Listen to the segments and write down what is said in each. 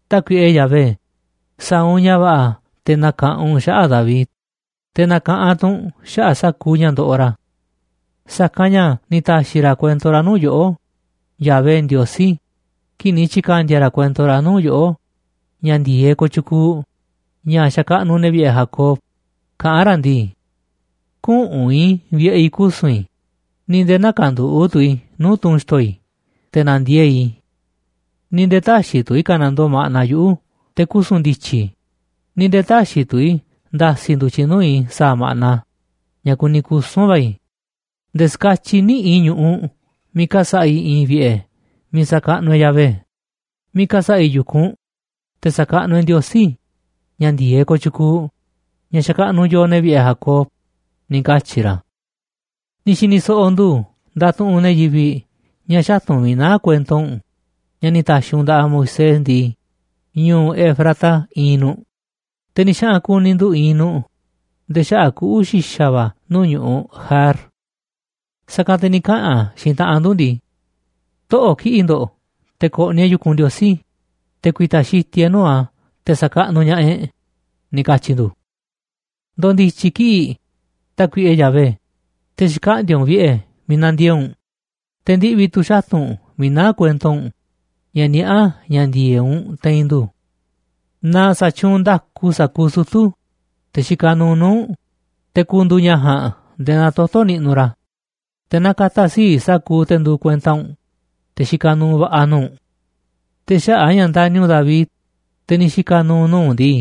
Tákuiꞌe Yahvé, sa̱a̱ u̱nꞌ ña̱ va̱ꞌa̱ te̱ na̱ka̱ꞌanꞌ u̱nꞌ xaꞌa̱ꞌ David, te̱ na̱ka̱ꞌanꞌ tu̱ u̱nꞌ xaꞌa̱ꞌ sa̱kuuꞌ ña̱ ndoꞌoꞌ ra̱. Sa̱kanꞌ ña̱ ni̱ ta̱xi̱ ra̱ kuento ra̱ nuu̱ꞌ yoꞌó, Yahvé Ndiosí, kii̱ꞌ ni̱ tyi̱ka̱ndi̱a̱ ra̱ kuento ra̱ nuu̱ꞌ yoꞌó, ña̱ ndi̱e̱eꞌ kooꞌ tyukuuꞌ, ña̱ xa̱kaꞌnuꞌ ne̱ vi̱ꞌe̱ Jacob, kaꞌán ra̱ ndii: “Küꞌu̱n i̱ vi̱ꞌe̱ i̱ kusu̱n i̱, ni̱ nde̱e̱ nä̱ka̱nduꞌu̱ꞌ tu̱ i̱ nuu̱ꞌ tunꞌ xi̱to̱ i̱ te̱ na̱ndiee̱ꞌ i̱, ni̱ nde̱e̱ tä̱xi̱ tu̱ i̱ ka̱nandoo ma̱ꞌna yuꞌu̱ te̱ kusu̱n ndi̱tyi̱ i̱, ni̱ nde̱e̱ tä̱xi̱ tu̱ i̱ nda̱si̱ ndu̱tyiꞌ nuu̱ꞌ i̱ sa̱a̱ ma̱ꞌna ña̱ kuni kusu̱n va̱ i̱, nde̱e̱ ska̱tyiꞌ niꞌi̱ꞌ i̱ ñu̱ꞌuꞌ miiꞌ ka̱sa̱ꞌa̱ i̱ i̱i̱n vi̱ꞌe̱ miiꞌ sa̱kaꞌnuꞌ e̱ꞌ Yahvé, miiꞌ ka̱sa̱ꞌa̱ i̱ yu̱kunꞌ, te̱ sa̱kaꞌnuꞌ e̱ꞌ Ndiosí, ña̱ ndi̱e̱eꞌ kooꞌ tyukuuꞌ, ña̱ xa̱kaꞌnuꞌ yooꞌ, ne̱ vi̱ꞌe̱ Jacob”, ni̱ katyi̱ ra̱. Ni̱ xi̱ni̱ so̱ꞌo̱ ndu̱ ndatuꞌunꞌ ne̱ yivi̱ꞌ ña̱ xatu̱nꞌ miiꞌ naá kuento u̱nꞌ ña̱ ni̱ ta̱xi̱ u̱nꞌ nda̱ꞌaꞌ Moisés ndii, ñu̱u̱ Efrata iinꞌ nu̱ꞌ, te̱ ni̱ xaꞌa̱n ku̱ni̱ ndu̱ iinꞌ nu̱ꞌ nde̱e̱ xaꞌa̱ꞌ kuꞌu̱ xi̱xa̱ va̱ nuu̱ꞌ ñu̱ꞌuꞌ Jaar. Sa̱kanꞌ te̱ ni̱ kaꞌa̱n xiinꞌ taꞌanꞌ ndu̱ ndii: “Toꞌo̱ꞌ kiꞌi̱ꞌ ndo̱ꞌ te̱ ko̱ꞌni̱ e̱ꞌ yu̱kunꞌ Ndiosí, te̱ ku̱i̱ta̱ xitiꞌ e̱ꞌ nuu̱ꞌ a̱ te̱ sa̱kaꞌnuꞌ ña̱ꞌaꞌ e̱ꞌ”, ni̱ katyi̱ ndu̱. Ndo̱ndi̱tyi̱ kiꞌi̱ꞌ, Tákuiꞌe Yahvé, te̱ xkaꞌndi̱a̱ u̱nꞌ vi̱ꞌe̱ miiꞌ na̱ndiee̱ꞌ u̱nꞌ, te̱ ndiꞌvi̱ tu̱ xatu̱nꞌ miiꞌ naá kuento u̱nꞌ ña̱ niaꞌá ña̱ ndi̱e̱eꞌ u̱nꞌ te̱i̱n ndu̱. Na sa̱tyuunꞌ nda̱ku sa̱kuuꞌ sutu̱, te̱ xikaꞌ nuuꞌ nuu̱ꞌ u̱nꞌ, te̱ ku̱ndu̱u̱ ña̱ ja̱a̱nꞌ nde̱e̱ naa toto̱ niꞌnuꞌ ra̱, te̱ na ka̱ta̱ sii̱ꞌ sa̱kuuꞌ te̱ nduuꞌ kuenta u̱nꞌ, te̱ xikaꞌ nuuꞌ va̱ꞌa̱ nuu̱ꞌ u̱nꞌ. Te̱ xaꞌa̱ꞌ a̱ ña̱ ndani̱ u̱nꞌ David, te̱ ni̱ xika̱ nu̱u̱ nuu̱ꞌ u̱nꞌ ndii,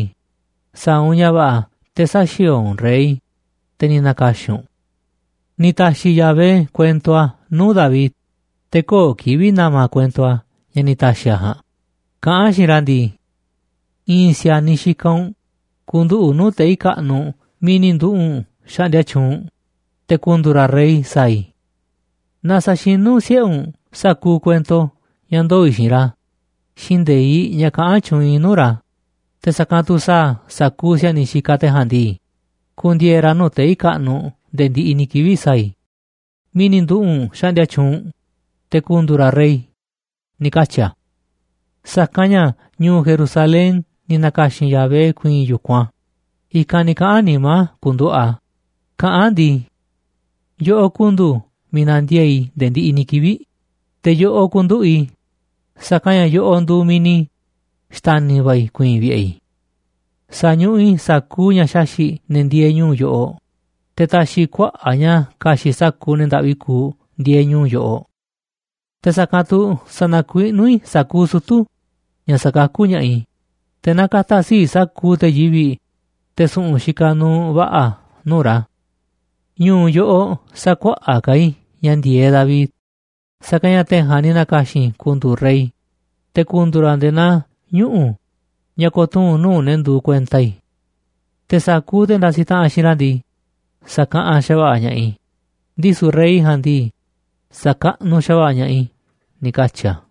sa̱a̱ u̱nꞌ ña̱ va̱ꞌa̱ te̱ sä̱xi̱o̱o̱ u̱nꞌ rey, te̱ ni̱ na̱ka̱xi̱n u̱nꞌ. Ni̱ ta̱xi̱ Yahvé kuento a̱ nuu̱ꞌ David, te̱ köo̱ꞌ kivi̱ꞌ na̱ma̱ a̱ kuento ña̱ ni̱ ta̱xi̱ a̱ ja̱a̱nꞌ, kaꞌán a̱ xiinꞌ ra̱ ndii: “I̱i̱n si̱a̱niꞌ xikaꞌ u̱nꞌ ku̱nduꞌu̱ꞌ nuu̱ꞌ tei̱ kaꞌnuꞌ miiꞌ ni̱ nduꞌu̱ꞌ u̱nꞌ xaꞌndia tyuunꞌ u̱nꞌ, te̱ ku̱ndu̱u̱ ra̱ rey sa̱a̱ i̱. Naaꞌ sa̱xinú siꞌe̱ u̱nꞌ sa̱kuuꞌ kuento ña̱ ndoo̱ i̱ xiinꞌ ra̱ xiinꞌ nde̱iꞌ ña̱ kaꞌán tyuunꞌ i̱ nuu̱ꞌ ra̱, te̱ sa̱kanꞌ tu̱ sa̱a̱ sa̱kuuꞌ si̱a̱niꞌ xikaꞌ te̱ ja̱a̱nꞌ ndii, ku̱ndi̱e̱e̱ ra̱ nuu̱ꞌ tei̱ kaꞌnuꞌ nde̱e̱ ndiꞌiꞌ ni̱ kivi̱ꞌ sa̱a̱ i̱ miiꞌ ni̱ nduꞌu̱ꞌ u̱nꞌ xaꞌndia tyuunꞌ u̱nꞌ, te̱ ku̱ndu̱u̱ ra̱ rey”, ni̱ katyi̱ a̱. Sa̱kanꞌ ña̱ ñu̱u̱ Jerusalén ni̱ na̱ka̱xi̱n Yahvé ku̱i̱i̱n yu̱kunꞌ a̱, i̱kanꞌ ni̱ kaꞌa̱n nimá a̱ ku̱nduꞌu̱ꞌ a̱, kaꞌán a̱ ndii: “Yoꞌoꞌ ku̱ndu̱u̱ miiꞌ na̱ndiee̱ꞌ i̱ nde̱e̱ ndiꞌiꞌ ni̱ kivi̱ꞌ, te̱ yoꞌoꞌ ku̱nduꞌu̱ꞌ i̱, sa̱kanꞌ ña̱ yoꞌoꞌ nduuꞌ miiꞌ ni̱ xta̱ni̱ va̱ i̱ ku̱i̱i̱n vi̱ꞌe̱ i̱. Sa̱ñuꞌuꞌ i̱ sa̱kuuꞌ ña̱ xaxi̱ꞌ ne̱ ndieeꞌ ñu̱u̱ yoꞌoꞌ, te̱ ta̱xi̱ i̱ kuaꞌa̱ꞌ ña̱ ka̱xi̱ꞌ sa̱kuuꞌ ne̱ ndaꞌvi kuuꞌ ndieeꞌ ñu̱u̱ yoꞌoꞌ. Te̱ sa̱kanꞌ tu̱ sa̱na̱kuiꞌnú i̱ sa̱kuuꞌ sutu̱ ña̱ sakakú ña̱ꞌaꞌ i̱, te̱ na ka̱ta̱ sii̱ꞌ sa̱kuuꞌ te̱ yivi̱ꞌ, te̱ su̱ꞌu̱n xikaꞌ nuuꞌ va̱ꞌa̱ nuu̱ꞌ ra̱. Ñu̱u̱ yoꞌoꞌ sa̱kuaꞌa̱ꞌ ka̱ i̱ ña̱ ndi̱e̱eꞌ David, sa̱kanꞌ ña̱ te̱ ja̱a̱nꞌ ni̱ na̱ka̱xi̱n i̱ ku̱ndu̱u̱ rey, te̱ ku̱ndu̱u̱ ra̱ nde̱e̱ naa ñuꞌu̱ ña̱ ko̱tuu̱n nuu̱ꞌ ne̱ nduuꞌ kuenta i̱. Te̱ sa̱kuuꞌ te̱ ndasiꞌ taꞌanꞌ xiinꞌ ra̱ ndii, sa̱kaꞌanꞌ xa̱va̱ꞌa̱ ña̱ꞌaꞌ i̱, ndisu̱ rey ja̱a̱nꞌ ndii, sa̱kaꞌnuꞌ xa̱va̱ꞌa̱ ña̱ꞌaꞌ i̱”, ni̱ katyi̱ a̱.